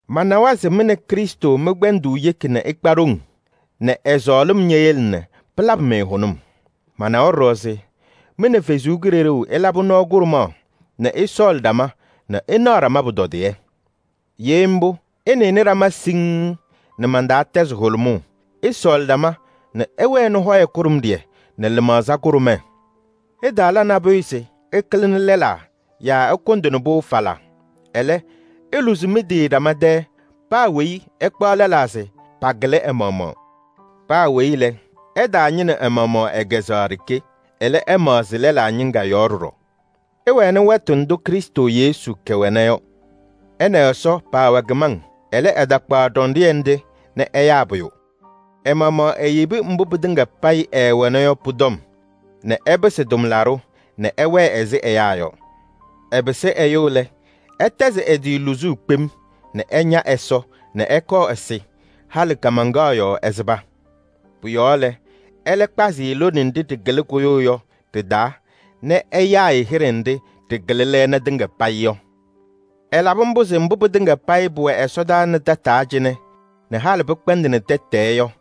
Manawa se mɩ nɛ Krɩstʋ mɩ-kpɛndʋʋ yeki nɛ ɩkpa ɖoŋ nɛ ɛ-sɔɔlɩm ñeyele nɛ pɩlabɩ-mɩ hʋnʋm. Manawa ɖɔɖɔ se mɩ nɛ Ɛsɔ Kalɩzaɣ ɩlabɩ nɔɔ kʋɖʋmaɣ nɛ ɩsɔɔlɩ ɖama nɛ ɩnaɣ ɖama pʋtɔdɩyɛ. Ye mbʋ, ɩnɩnɩ ɖama siŋŋ nɛ man-taa tɛzɩ hʋlʋmʋʋ, ɩsɔɔlɩ ɖama nɛ ɩwɛnɩ hɔyɛ kʋɖʋmɖɩyɛ nɛ lɩmaɣza kʋɖʋmɛɛ. Ɩtaala nabʋyʋ se ɩkɩlɩnɩ lɛlaa yaa ɩkʋndɩnɩ-pʋ falaa. Ɛlɛ, iluzi mɩ-tɩ ɖama tɛɛ, paa weyi ɛkpaɣ lɛlaa se pakɩlɩ ɛ-maɣmaɣ. Paa weyi lɛ, ɛtaañɩnɩ ɛ-maɣmaɣ ɛ-kɛzɛɣa ɖeke. Ɛlɛ, ɛmaɣzɩ lɛlaa ñɩŋga yɔɔ ɖɔɖɔ. Ɩwɛnɩ wɛtʋ ndʋ Krɩstʋ Yesu kɛwɛna yɔ. Ɛ nɛ Ɛsɔ paawɛ kɩmaŋ. Ɛlɛ, ɛtakpaɣ ɖɔndɩyɛ nɖɩ nɛ ɛyaa pʋyʋ. Ɛ-maɣmaɣ eyebi mbʋ pɩtɩŋa payɩ ɛɛwɛna yɔ pʋ-tɔm nɛ ɛpɩsɩ tʋmlaɖʋ nɛ ɛwɛɛ ɛzɩ ɛyaa yɔ. Ɛpɩsɩ ɛyʋ lɛ, ɛtɛzɩ ɛ-tɩ luzuu kpem nɛ ɛña Ɛsɔ nɛ ɛkɔɔ ɛsɩ. Halɩ kaamaŋkaɣ yɔɔ ɛsɩba. Pʋ-yɔɔ ɛlɛ kpazɩ-ɩ lone nɖɩ ɖɩkɩlɩ kʋyʋʋ yɔ ɖɩ-taa nɛ ɛyaa-ɩ hɩɖɛ nɖɩ ɖɩkɩlɩ lɛɛna tɩŋa payɩ yɔ. Ɛlabɩ mbʋ se mbʋ pɩtɩŋa payɩ pʋwɛ ɛsɔdaa nɛ tataa cɩnɛ nɛ halɩ pɩkpɛndɩnɩ tɛtɛɛ yɔ,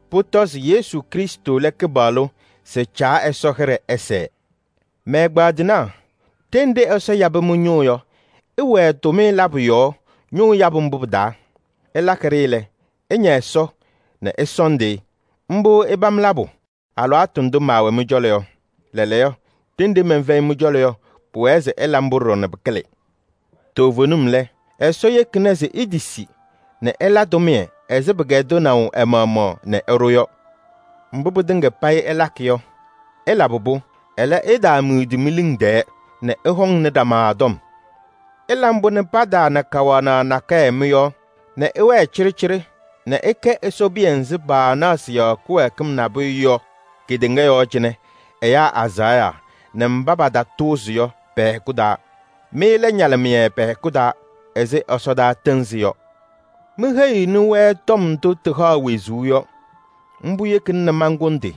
pʋtɔ se Yesu Krɩstʋ lɛ Kɩpaɣlʋ se Caa Ɛsɔ hɩɖɛ ɛsɛɛ. Mɛ-ɛgbaadɩnaa! Ɖenɖe Ɛsɔ yabɩ mɩ-ñʋʋ yɔ, ɩwɛɛ tʋmɩyɛ labʋ yɔɔ ñʋʋ yabʋ mbʋ pɩ-taa. Ɩlakɩ-ɖɩ lɛ, ɩña Ɛsɔ nɛ ɩsɔɔndɩ-ɩ. Mbʋ ɩpam labʋ alɩwaatʋ ndʋ maawɛ mɩ-cɔlɔ yɔ. Lɛɛlɛɛyɔ, ɖenɖe mɛnfɛyɩ mɩ-cɔlɔ yɔ, pʋwɛɛ se ɩla mbʋ ɖɔɖɔ nɛ pɩkɩlɩ. Toovenim lɛ, Ɛsɔ yekina se itisi nɛ ɩla tʋmɩyɛ ɛzɩ pɩkɛdɩnaʋ ɛ-maɣmaɣ nɛ ɛɖʋ yɔ. Mbʋ pɩtɩŋa payɩ ɩlakɩ yɔ, ɩlabɩ-pʋ, ɛlɛ, ɩtaamidi mi-liŋ tɛɛ nɛ ɩhɔŋnɩ ɖama tɔm. Ɩla mbʋ nɛ pataana kawanaɣ nakɛyɛ mɩ-yɔɔ nɛ ɩwɛɛ cɩɖɩcɩɖɩ nɛ ɩkɛ Ɛsɔ piya nzɩ paanaɣ sɩ-yɔɔ kɩwɛɛkɩm nabʋyʋ yɔ kedeŋa yɔɔ cɩnɛ ɛyaa azaɣa nɛ kɩtatʋʋzɩŋ pɛ-hɛkʋ taa. Mɩ lɛ ñalɩmɩyɛ pɛ-hɛkʋ taa ɛzɩ ɛsɔdaa tɩɩnzɩ yɔ. Miheyiɣni-wɛ tɔm ndʋ tɩhaɣ wezuu yɔ. Mbʋ yekina nɛ mankʋndɩ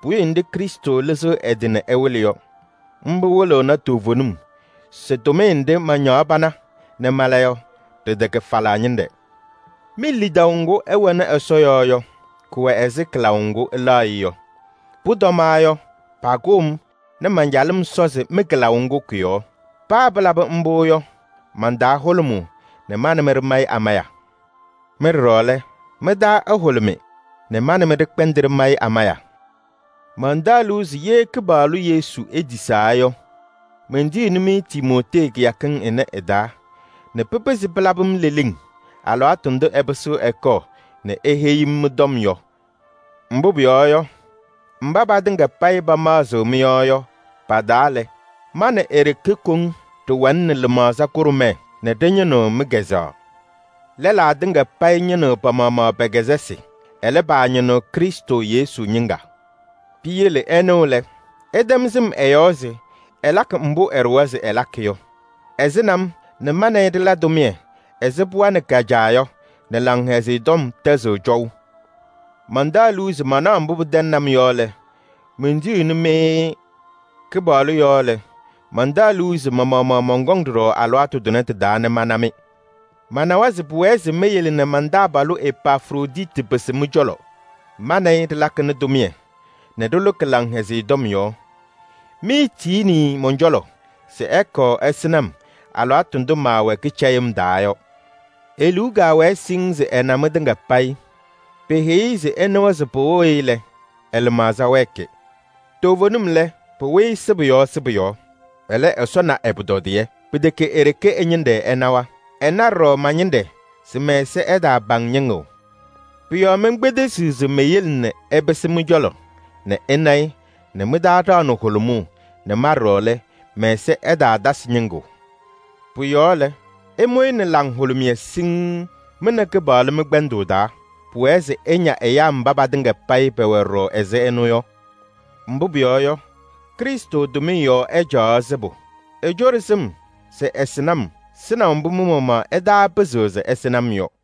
puwiye nɖɩ Krɩstʋ lɩzɩɣ ɛ-tɩ nɛ ɛwɩlɩ yɔ. Mbʋ wɩlɩɣnɩ toovenim se tʋmɩyɛ nɖɩ mañaɣ pana nɛ mala yɔ, ɖɩtɛkɛ falaa ñɩnɖɛ. Mi-lidaʋ ŋgʋ ɩwɛnɩ Ɛsɔ yɔɔ yɔ, kʋwɛ ɛzɩ kɩlaʋ ŋgʋ ɩlaɣ-ɩ yɔ. Pʋtɔma yɔ, pakʋʋ-m nɛ man-calɩm sɔzɩ mɩ-kɩlaʋ ŋgʋ kʋ-yɔɔ. Paa pɩlaba mbʋ yɔ, man-taa hʋlʋmʋʋ nɛ ma nɛ mɩ ɖɩmayɩ amaya. Mɩ ɖɔɖɔ lɛ, mɩ-taa ɛhʋlʋmɩ nɛ ma nɛ mɩ ɖɩkpɛndɩ ɖɩmayɩ amaya. Mantaɣ liu se ye Kɩpaɣlʋ Yesu etisaa yɔ, mentiyiɣni-mɩ Timootee kɩyakɩŋ ɩnɛ ɩ-taa nɛ pɩpɩzɩ pɩlabɩ-m leleŋ alɩwaatʋ ndʋ ɛpɩsɩɣ ɛkɔɔ nɛ eheyi-m mɩ-tɔm yɔ. Mbʋ pʋyɔɔ yɔ, mba patɩŋa payɩ pamaɣzɩɣ mɩ-yɔɔ yɔ, pa-taa lɛ, ma nɛ e-ɖeke koŋ ɖɩwɛnɩnɩ lɩmaɣza kʋɖʋmɛɛ nɛ ɖɩñɩnɩɣ mɩ-kazʋwa. Lɛlaa tɩŋa payɩ ñɩnɩɣ pa-maɣmaɣ pɛ-kɛzɛsɩ, ɛlɛ paañɩnɩɣ Krɩstʋ Yesu ñɩŋga. Piyele ɛnʋ lɛ, ɩtɛm sɩm ɛ-yɔɔ se ɛlakɩ mbʋ ɛɖʋwa se ɛlakɩ yɔ: ɛsɩnɩ-m nɛ ma nɛ ɩ ɖɩla tʋmɩyɛ ɛzɩ pɩɣa nɛ ka-caa yɔ nɛ Laŋhɛzɩyɛ Tɔm tɛzɩɣ cɔʋ. Mantaɣ liu se mantɩnaɣ mbʋ pɩtɛŋnɩ-m yɔ lɛ, mentiyiɣni-mɩ-ɩ. Kɩpaɣlʋ yɔɔ lɛ, mantaɣ liu se ma-maɣmaɣ mɔnkɔŋ ɖɔɖɔ alɩwaatʋ tʋnɛ tɩ-taa nɛ mana-mɩ. Manawa se pʋwɛɛ se meyele nɛ man-taabalʋ Epafroditi pɩsɩ mɩ-cɔlɔ. Ma nɛ ɩ ɖɩlakɩnɩ tʋmɩyɛ nɛ ɖɩlʋkɩ Laŋhɛzɩyɛ Tɔm yɔɔ. Miitiyini-i mɔn-cɔlɔ se ɛkɔɔ ɛsɩnɩ-m alɩwaatʋ ndʋ maawɛ kɩcɛyɩm taa yɔ. E-liu kaawɛ siŋŋ se ɛna mɩtɩŋa payɩ. Peheyi-i se ɩnɩwa se pɩwɩɣ-ɩ lɛ, ɛ-lɩmaɣza wɛɛkɩ. Toovenim lɛ, pɩwɩ-ɩ sɩbʋ yɔɔ sɩbʋ yɔɔ. Ɛlɛ, Ɛsɔ na ɛ-pʋtɔdɩyɛ. Pɩtɛkɛ e-ɖeke ɛ-ñɩnɖɛ ɛnawa. Ɛna ɖɔɖɔ ma-ñɩnɖɛ se mɛ-ɛza ɛtaapaŋ ñɩŋʋʋ. Pʋ-yɔɔ menkpedesiɣ se meyele nɛ ɛpɩsɩ mɩ-cɔlɔ nɛ ɩna-ɩ nɛ mɩ-taa ɖaɣnɩ hʋlʋmʋʋ nɛ ma ɖɔɖɔ lɛ, mɛ-ɛza ɛtaatasɩ ñɩŋʋʋ. Pʋ-yɔɔ lɛ, ɩmʋ-ɩ nɛ laŋhʋlʋmɩyɛ siŋŋ mɩ nɛ Kɩpaɣlʋ mɩ-kpɛndʋʋ taa. Pʋwɛɛ se ɩña ɛyaa mba patɩŋa payɩ pɛwɛ ɖɔɖɔ ɛzɩ ɛnʋ yɔ. Mbʋ pʋyɔɔ yɔ, Krɩstʋ tʋmɩyɛ yɔɔ ɛcaɣaɣ sɩbʋ: ecoɖi sɩm se ɛsɩnɩ-m sɩnaʋ mbʋ mɩ-maɣmaɣ ɩtaapɩzɩɣ se ɩsɩnɩ-m yɔ.